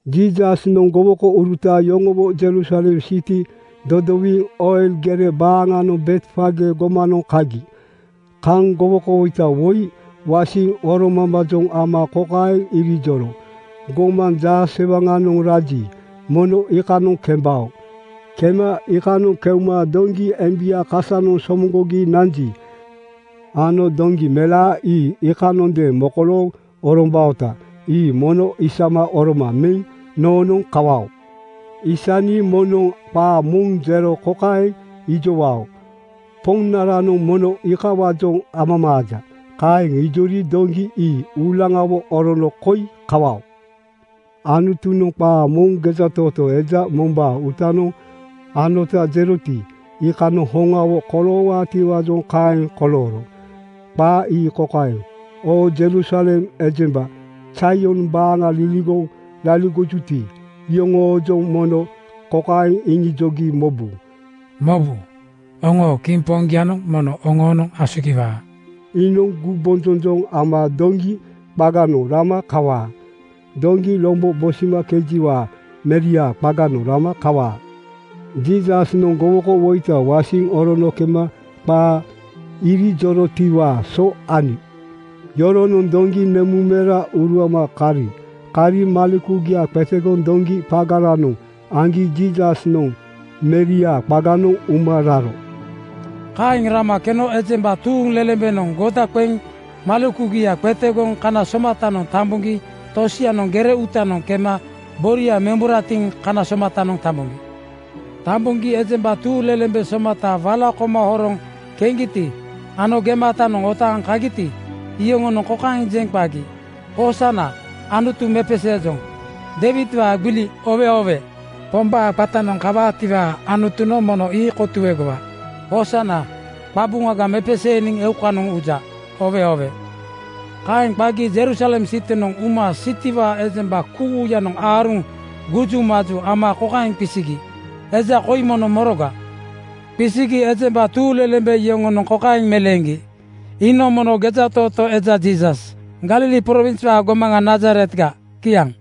Jiisasnoŋ gowokouruta yoŋowo Jerusalem siti dodowiŋ Oil gere baaŋanoŋ Betfage gomanoŋ kagi. Kaŋ gowokowoita woi wasiŋ oromambaajoŋ ama kokaeŋ irijoro, “Gomaŋ jaasewaŋsewaŋ raji, mono iikanoŋ kembao. Kema iikanoŋ keuma doŋgi embia kasanoŋ somoŋgogi nanji ano doŋgi melaa ii iikanondeeŋ mokolooŋ orombaota. Ii mono isama oroma meŋ noonoŋ kawao. “Aisni moŋnoŋ qaa moŋ jero kokaeŋ ijowao, ‘Poŋnaranoŋ mono iikawaajoŋ amamaaja.’ Kaeŋ ijori doŋgi ii uulaŋawo orono koi kawao.” Anutunoŋ qaa moŋ gejatootoo eja mombaa uutanoŋ anota jeroti, iikanoŋ hoŋawo koloowaatiwaajoŋ kaeŋ kolooro. Qaa ii kokaeŋ, “Oo Jerusalem ejemba Zaion baaŋa liligoŋ laligojuti, iyoŋoojoŋ mono kokaeŋ iŋijogi mobu, ‘Mobu, oŋoo kiŋ poŋgianoŋ mono oŋoonoŋ asugiwaa. Iinoŋ gumbonjonjoŋ ama doŋgi qaganoŋ rama kawaa. Doŋgi lombo bosimakejiwaa meriaa qaganoŋ rama kawaa.” ’ Jiisasnoŋ gowokowoita wasiŋ orono kema qaa irijorotiwaa so ani. Yoronoŋ doŋgi nemuŋmera uruama kari. Kari malekugia qetegoŋ doŋgi qagaranoŋ aŋgi Jiisasnoŋ meriaa qaganoŋ uma raro. Kaeŋ rama keno ejemba tuuŋlelembenoŋ goda qeŋ malekugia qetegoŋ kana somatanoŋ tamboŋgi tosianoŋ gere uutanoŋ kema boria memburatiŋ kana somatanoŋ tamboŋgi. Tamboŋgi ejemba tuuŋlelembe somata wala koma horoŋ keŋgiti ano gematanoŋ otaaŋ kagiti, iyoŋonoŋ kokaeŋ jeŋ qagi, “Hoosana! Anutu mepeseejoŋ. Deiwidwaa gbili oowe oowe! Pombaa qatanoŋ kawaati, Anutunoŋ mono ii kotuegowa. Hoosana! Qabuŋaga mepeseeniŋ eukanoŋ uja! Oowe oowe!” Kaeŋ qagi Jerusalem sitinoŋ uma sitiwaa ejemba kuuyanoŋ aaruŋ gujumaju ama kokaeŋ qisigi, “Eja koi mono moroga?” Qisigi ejemba tuuŋlelembe yoŋonoŋ kokaeŋ meleeŋgi, “Iinoŋ mono gejatootoo eja Jiisas, Galili prowinswaa gomaŋa Nazaretga.” Kiaŋ.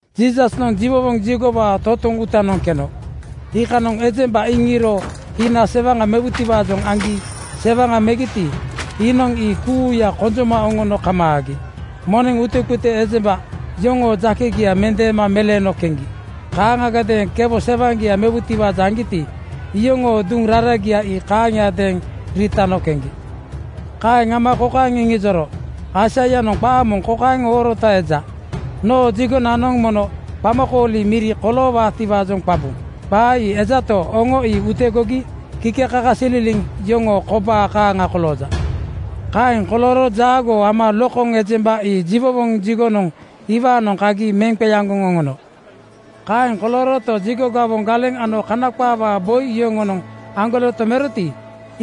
Jiisasnoŋ jiwowoŋ jigowaa totoŋ uutanoŋ keno. Iikanoŋ ejemba iŋiiro hina sewaŋa mewutiwaajoŋ aŋgi sewaŋa megiti, iinoŋ ii kuuya konjoma oŋono kamaagi. Moneŋ utekute ejemba yoŋoo jakegia metaama meleeno keŋgi. Kaaŋagadeeŋ kewo sewaŋgia mewutiwaajoŋ aŋgiti, iyoŋoo duŋ raragia ii kaaŋiadeeŋ riitano keŋgi. Kaeŋ ama kokaeŋ iŋijoro, “Aisaianoŋ qaa moŋ kokaeŋ oorota eja, ‘Noo jigonanoŋ mono qamakooli miri koloowaatiwaajoŋ qabu.’ Qaa ii ejato, oŋo ii utegogi kikekakasililiŋ yoŋoo kobaa kaaŋa kolooja.” Kaeŋ kolooro jaagoo ama lokoŋ ejemba ii jiwowoŋ jigonoŋ iwaanoŋ kagi meŋ qeaŋgoŋ oŋono. Kaeŋ kolooroto, jigo gawoŋ galeŋ ano Kana qaawaa boi yoŋonoŋ aŋgoleto meroti,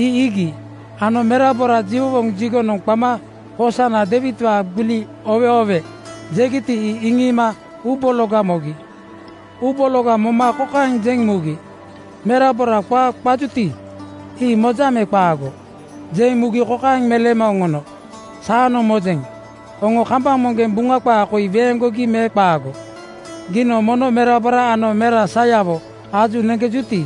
ii iigi ano merabora jiwowoŋ jigonoŋ qama “Hoosana! Deiwidwaa gbili oowe oowe!” jegiti, ii iŋiima uubologa mogi. Uu bologa moma kokaeŋ jeŋ mugi, “Merabora qaa qajuti, ii mojaŋ me qaago?” Jeŋ mugi kokaeŋ meleema oŋono, “Saanoŋ mojeŋ. Oŋo kambaŋ moŋgeŋ Buŋa qaa koi weeŋgogi me qaago, ‘Giinoŋ mono merabora ano mera sayawo aju neŋkejuti,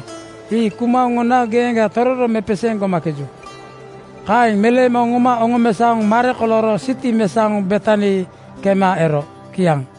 ii kuma oŋona geeŋga tororo mepeseeŋ gomakeju.” ’ Kaeŋ meleema oŋoma oŋomesaoŋ mare kolooro siti mesaoŋ Betani kema ero. Kiaŋ.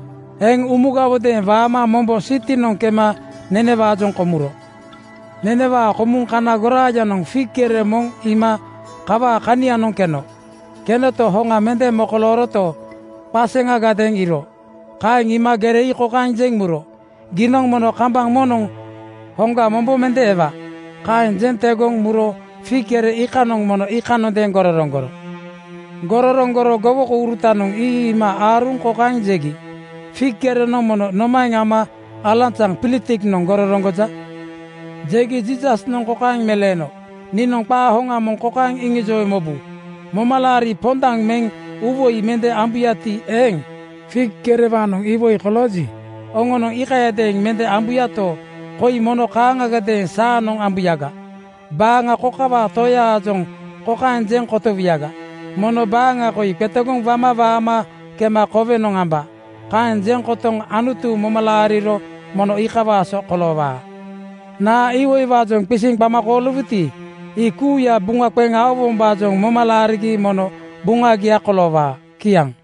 Eŋ umugawodeeŋ waama mombo sitinoŋ kema nenewaajoŋ komuro. Nembanenewaa komuŋ kana goraayanoŋ fig gere moŋ iima kawaa kanianoŋ keno. Kenoto, hoŋa mende mokolooroto, qaseŋagadeeŋ iiro. Kaeŋ iima gere ii kokaeŋ jeŋ muro, “Giinoŋ mono kambaŋ moŋnoŋ hoŋga mombo mende ewa.” Kaeŋ jeŋ tegoŋ muro fig gere iikanoŋ mono iikanondeeŋ gororoŋgoro. Gororoŋgoro gowokourutanoŋ ii iima aaruŋ kokaeŋ jegi, “Fig gerenoŋ mono nomaeŋ ama alanzaŋ pilitiknoŋ gororoŋgoja?” Jegi Jiisasnoŋ kokaeŋ meleeno, “Niinoŋ qaa hoŋa moŋ kokaeŋ iŋijowe mobu: Momalaari pondaŋ meŋ uuwoi mende ambuyati eeŋ, fig gerewaanoŋ iwoi kolooji, oŋonoŋ iikayadeeŋ mende ambuyato, koi mono kaaŋagadeeŋ saanoŋ ambuyaga: Baaŋa kokawaa toyaajoŋ kokaeŋ jeŋ kotowuyaga, ‘Mono baaŋa koi qetegoŋ wama waama kema kowenoŋ amba.’ Kaeŋ jeŋ kotoŋ Anutu moma laariro mono iikawaa so koloowaa. Naa iwoiwaajoŋ qisiŋ qama kooliwuti, ii kuuya buŋa qeŋ aowombaajoŋ moma laarigi mono buŋagia koloowaa.” Kiaŋ.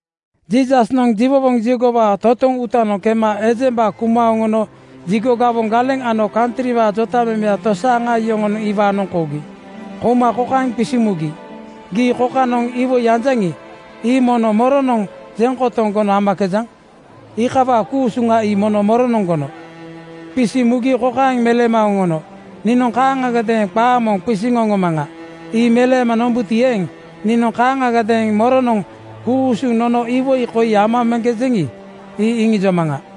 Jiisasnoŋ jiwowoŋ jigowaa totoŋ uutanoŋ kema ejemba kuma oŋono jigo gawoŋ galeŋ ano kantriwaa jotamemeya tosaaŋa yoŋonoŋ iwaanoŋ kougi. Kouma kokaeŋ qisiŋ mugi, “Gii kokanoŋ iwoi anjaŋi, ii mono moronoŋ jeŋ kotoŋ gono amakejaŋ? Iikawaa ku-usuŋa ii mono moronoŋ gono?” Qisiŋ mugi kokaeŋ meleema oŋono, “Niinoŋ kaaŋagadeeŋ qaa moŋ qisiŋ oŋomaŋa. Ii meleema nombuti eeŋ, niinoŋ kaaŋagadeeŋ moronoŋ ku-usuŋ nono iwoi koi amakejeŋi, ii iŋijomaŋa.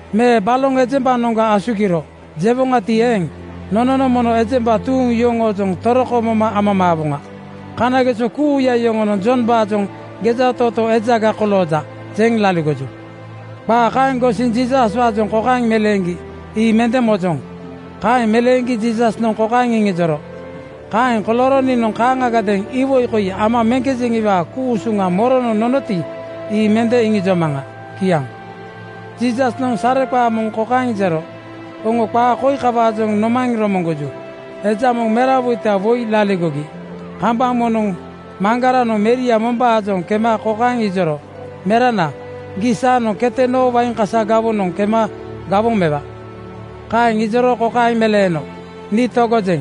Me ‘Baloŋ ejembanoŋga asugiro,’ jewoŋati eeŋ, nononoŋ mono ejemba tuuŋ yoŋoojoŋ toroko moma amamaawoŋa. Kanageso kuuya yoŋonoŋ Jombaajoŋ ‘Gejatootoo ejaga kolooja,’ jeŋ laligoju.” Qaa kaeŋ gosiŋ Jiisaswaajoŋ kokaeŋ meleeŋgi, “Ii mende mojoŋ.” Kaeŋ meleeŋgi Jiisasnoŋ kokaeŋ iŋijoro, “Kaeŋ kolooro niinoŋ kaaŋagadeeŋ iwoi koi amakejeŋiwaa ku-usuŋa moronoŋ nonoti, ii mende iŋijomaŋa.” Kiaŋ. Jiisasnoŋ sareqaa moŋ kokaeŋ jero, “Oŋo qaa koi kawaajoŋ nomaeŋ romoŋgoju? Eja moŋ merawoita woi laligogi. Kambaŋ moŋnoŋ maŋgaranoŋ meria mombaanoŋ kema kokaeŋ ijoro, ‘Merana, gii saanoŋ kete noo wain kasa gawonoŋ kema gawoŋ mewa.’ Kaeŋ ijoro kokaeŋ meleeno, ‘Nii togojeŋ.’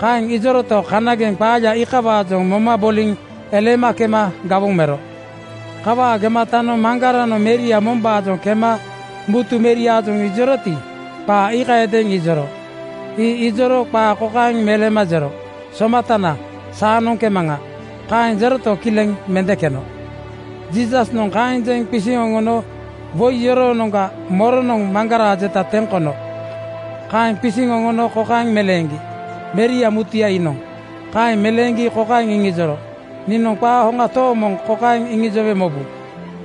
Kaeŋ ijoroto, kanageŋ qaaya iikawaajoŋ moma boliŋ eleema kema gawoŋ mero. Kawaa gematanoŋ maŋgaranoŋ meria mombaanoŋ kema mutu meriaajoŋ ijoroti, qaa iikayadeeŋ ijoro. Ii ijoro qaa kokaeŋ meleema jero, ‘Somatana, saanoŋ kemaŋa.’ Kaeŋ jeroto, kileŋ mende keno.” Jiisasnoŋ kaeŋ jeŋ qisiŋ oŋono, “Woi yoroonoŋga moronoŋ maŋgaraa jeta teŋ kono?” Kaeŋ qisiŋ oŋono kokaeŋ meleeŋgi, “Meria mutuya iinoŋ.” Kaeŋ meleeŋgi kokaeŋ iŋijoro, “Niinoŋ qaa hoŋa tooŋ moŋ kokaeŋ iŋijowe mobu: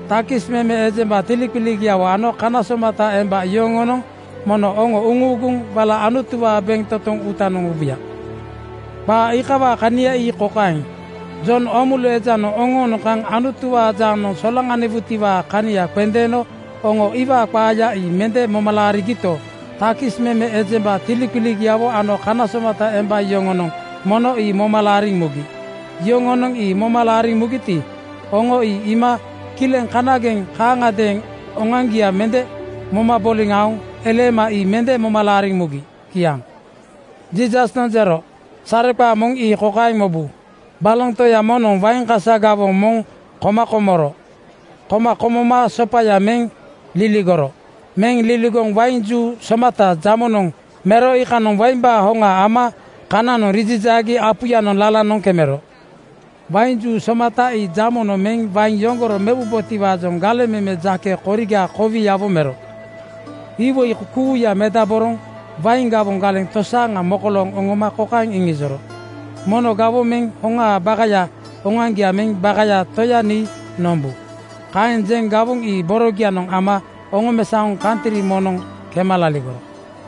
Takis meme ejemba tiliqiligiawo ano kana somata emba yoŋonoŋ mono oŋo uŋuuguŋ wala Anutuwaa bentotoŋ uutanoŋ ubuya. “Qaa iikawaa kania ii kokaeŋ: Jon Oomulu ejanoŋ oŋoonoŋ kaŋ Anutuwaa jaanoŋ solaŋaniwoŋatiwaa kania qendeeno oŋo iwaa qaaya ii mende moma laarigito, takis meme ejemba tiliqiligiawo ano kana somata emba yoŋonoŋ mono ii moma laariŋ mugi. Yoŋonoŋ ii moma laariŋ mugiti, oŋo ii iima kileŋ kanageŋ kaaŋagadeeŋ oŋoaŋgia mende moma boliŋ aoŋ eleema ii mende moma laariŋ mugi.” Kiaŋ. Jiisasnoŋ jero, “Sareqaa moŋ ii kokaeŋ mobu: Baloŋ toya moŋnoŋ wain kasa gawoŋ moŋ koma komoro. Koma komoma sopaya meŋ liligoro. Meŋ liligoŋ wain juu somata jamonoŋ mero. Iikanoŋ waimbaa hoŋa ama kananoŋ rijijaagi apuyanoŋ lalanoŋ kemero. Wain juu somata ii jamonoŋ meŋ wain yoŋgoro mewubotiwaajoŋ galeŋ meme jake koriga kowiawo mero. Iwoi kuuya medaboroŋ wain gawoŋ galeŋ tosaaŋa mokolooŋ oŋoma kokaeŋ iŋijoro, ‘Mono gawoŋ meŋ hoŋaa bakaya oŋoaŋgia meŋ bakaya toya nii nombu.’ Kaeŋ jeŋ gawoŋ ii borogianoŋ ama oŋomesaoŋ kantri moŋnoŋ kema laligoro.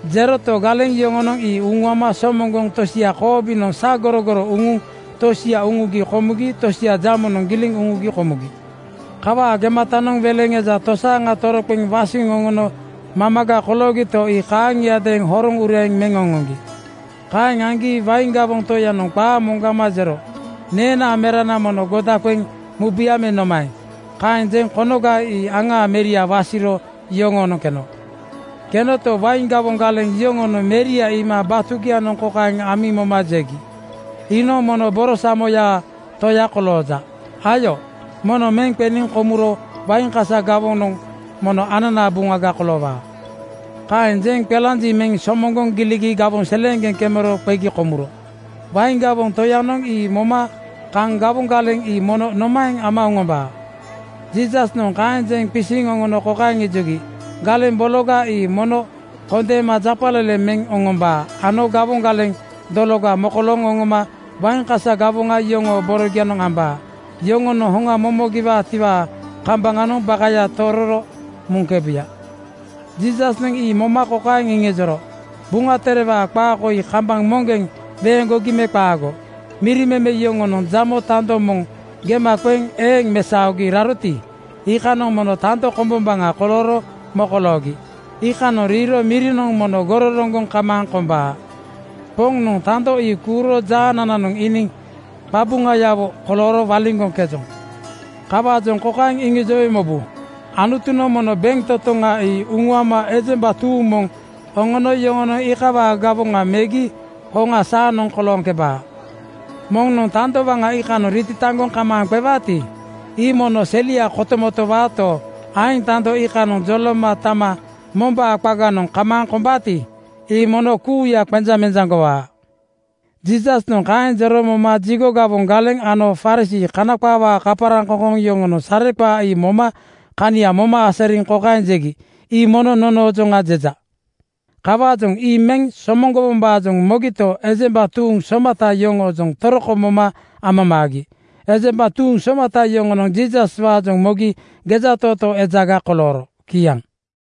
Jeroto, galeŋ yoŋonoŋ ii uŋuama somoŋgoŋ tosia koobinoŋ sagorogoro uŋuŋ tosia uŋugi komugi tosia jamonoŋ giliŋ uŋugi komugi. Kawaa gematanoŋ weleŋ eja tosaaŋa toroqeŋ wasiŋ oŋono mamaga koloogito, ii kaaŋiadeeŋ horoŋ ureeŋ meŋ oŋoŋgi. “Kaeŋ aŋgi wain gawoŋ toyanoŋ qaa moŋgama jero, ‘Neenaa merana mono goda qeŋ mubuya me nomaeŋ?’ Kaeŋ jeŋ konoga ii aŋaa meria wasiro yoŋoonoŋ keno. Kenoto, wain gawoŋ galeŋ yoŋonoŋ meria iima batugianoŋ kokaeŋ amiŋ moma jegi, ‘Iinoŋ mono borosamoyaa toya kolooja. Ayo, mono meŋ qeniŋ komuro wain kasa gawoŋanoŋ mono ananaa buŋaga koloowaa.’ “Kaeŋ jeŋ qelanjiŋ meŋ somoŋgoŋ giligi gawoŋ seleeŋgeŋ kemero qegi komuro. Wain gawoŋ toyanoŋ ii moma kaŋ gawoŋ galeŋ ii mono nomaeŋ ama oŋombaa?” Jiisasnoŋ kaeŋ qisiŋ oŋono kokaeŋ ijogi, “Galeŋ bologa ii mono kondeema japaleleŋ meŋ oŋombaa ano gawoŋ galeŋ dologa mokolooŋ oŋoma wain kasa gawoŋa yoŋoo boronoŋ ambaa. Yoŋonoŋ hoŋa momogowaatiwaa kambaŋanoŋ bakaya tororo muŋkebuya.” Jiisasnoŋ ii moma kokaeŋ iŋijoro, “Buŋa Terewaa qaa koi kambaŋ moŋgeŋ weeŋgogi me qaago, ‘Miri meme yoŋonoŋ jamo tando moŋ gema qeŋ eeŋ mesaogi raroti, iikanoŋ mono tando kombombaŋa kolooro mokoloogi. Iikanoŋ riiro mirinoŋ mono gororoŋgoŋ kamaaŋ kombaa. Poŋnoŋ tando ii kuuro jaanananoŋ iiniŋ qabuŋayawo kolooro waliŋgoŋkejoŋ?’ “Kawaajoŋ kokaeŋ iŋijowe mobu, Anutunoŋ mono bentotoŋa ii uŋuama ejemba tuuŋ moŋ oŋono yoŋonoŋ iikawaa gawoŋa megi hoŋa saanoŋ kolooŋkebaa. Moŋnoŋ tando waŋa iikanoŋ ritataŋgoŋ kamaaŋ qewaati, ii mono selia kotomotowaato, aeŋ tando iikanoŋ joloma tama mombaa qaganoŋ kamaaŋ kombaati, ii mono kuuya qenjaŋmenjaŋgowaa.” Jiisasnoŋ kaeŋ jero moma jigo gawoŋ galeŋ ano Farisii (Kana qaawaa kaparaŋkoŋkoŋ) yoŋonoŋ sareqaaya ii moma kania moma asariŋ kokaeŋ jegi, “Ii mono nonoojoŋa jeja.” Kawaajoŋ ii meŋ somoŋgowombaajoŋ mogito, ejemba tuuŋ somata yoŋoojoŋ toroko moma amamaagi. Ejemba tuuŋ somata yoŋonoŋ Jiisaswaajoŋ mogi gejatootoo ejaga kolooro. Kiaŋ.